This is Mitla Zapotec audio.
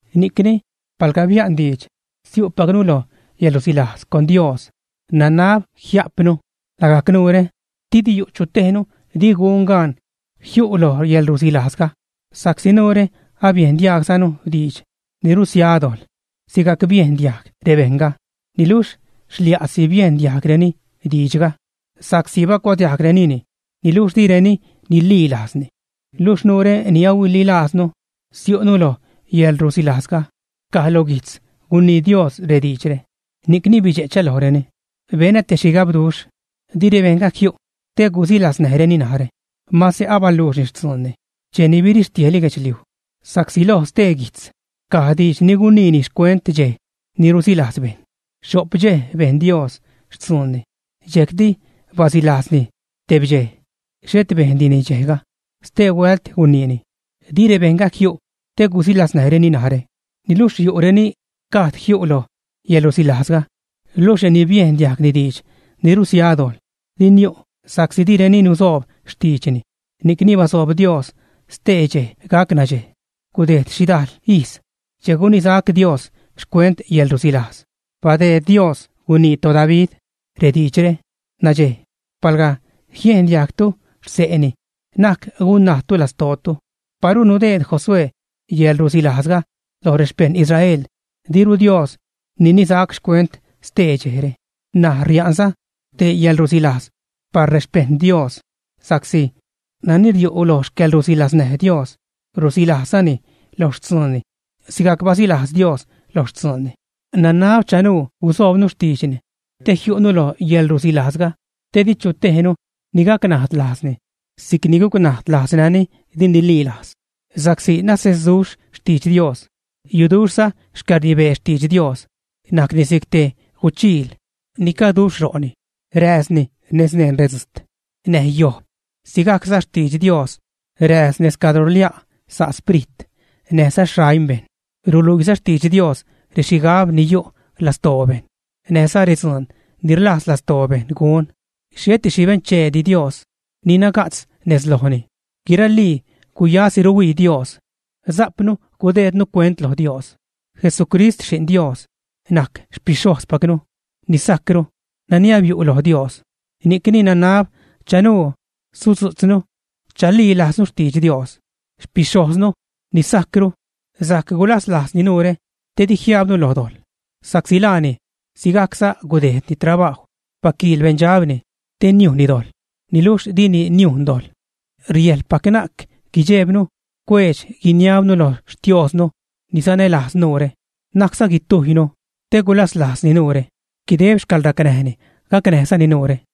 Ni'cni palga bia'n diidx siu'pacnu lo yäḻrusilajz con Dios, nanab jia'pnu lagajc nuure didi yu' chu tejnu di gun gaan jiu' lo yäḻrusilajzga. Sa'csi nuure abiejn diaagzanu diidx ni rusia dojḻ, sigajc biejn diajg rebejṉga; niluxh xlia'si biejn diajgreni diidxga sa'csi bacuadiajgrenini niluxh direni nililajzni. Luxh nuure ni ahuililaaznu siu'nu lo yäḻrusilajzga; caj lo guijtz gunii Dios rediidxre: Ni'cni bidxe'chä lojreni, benä te xhigabduxh, di rebejṉga jiu' te gusilaznäjreni narä. Mase abaluuxni xtzuunni cheni birixtiejli guedxliuj. Sa'csi loj stee guijtz caj diidx ni guniini xcuent dxej ni rusilajz bejṉ: Xho'p dxej bejn Dios xtzuunni, dxejcti basilajzni tebdxej. Xhet bejndini dxejga. Stehuält guniini: Di rebejṉga jiu' te gusilaznäjreni narä. Niluxh yu' reni gajd jiu' loj yäḻrusilajzga, luxh reni biejn diajgni diidx ni rusia dojḻ di niu' sa'csi direni nusoob xtiidxni. Ni'cni basoob Dios ste dxej gac “nadxej”. Gudejd xhidajl ijz che gunisac Dios xcuent yäḻrusilajz. Badeed Dios gunii toDavid rediidxre: Nadxej, palga jiendiajgtu xse'ni, na'c gunnajdtu lastootu. Paru nudeed Josué yäḻrusilajzga loj rexpeṉ Israel, diru Dios ninisac xcuent stee dxejre. N̲aj ria'nza te yäḻrusilajz par rexpejṉ Dios, sa'csi nani riu' lo xcäḻrusilaznäj Dios, rusilajzzani lo xtzuunni sigajc basilajz Dios lo xtzuunni. Nanab chanuu gusoobnu xtiidxni te jiu'nu lo yäḻrusilajzga, te di chu tejnu ni gacnajd lajzni si'c ni gucnajd lajz renani di nililajz. Sa'csi nasesduxh xtidx Dios, yuduxhza xcäḻrnibee xtidx Dios. Najcni si'c te guchiil ni caduxh ro'ni, rääzni nez neṉ redzujt näj yojb. Sigajcza xtidx Dios rääz nez cadro rlia' sa' xsprit näjza xaim bejṉ. Ruluiiza xtidx Dios rexhigab ni yu' lastoo bejṉ, näjza redzuun ni rlajz lastoo bejṉ gun. Xheti xhi bencheedi Dios ni naga'tz nez lojni. Guiralii guyasi ruhuii Dios. Sajpnu gudeednu cuent lo Dios. Jesucrist, Xi'n Dios, najc xpixhojzpacnu ni sajcru, nani abiu' loj Dios. Ni'cni nanab chanuu sudzu'tznu chalilaaznu xtidx Dios. Xpixhojznu ni sajcru sajc gulaslajzni nuure te di jiajbnu lo dojḻ, sa'csi laani sigajcza gudejdni trabajw, baquiil beṉdxabni te niujnni dojḻ, niluxh dini niujn dojḻ. Riäjḻpac na'c guidxeebnu cuedx-guiniabnu lo Xtiosnu ni sanälajz nuure. Na'cza guitujynu, te gulaslajzni nuure, guideb xcäḻracnäjni gacnäjzani nuure.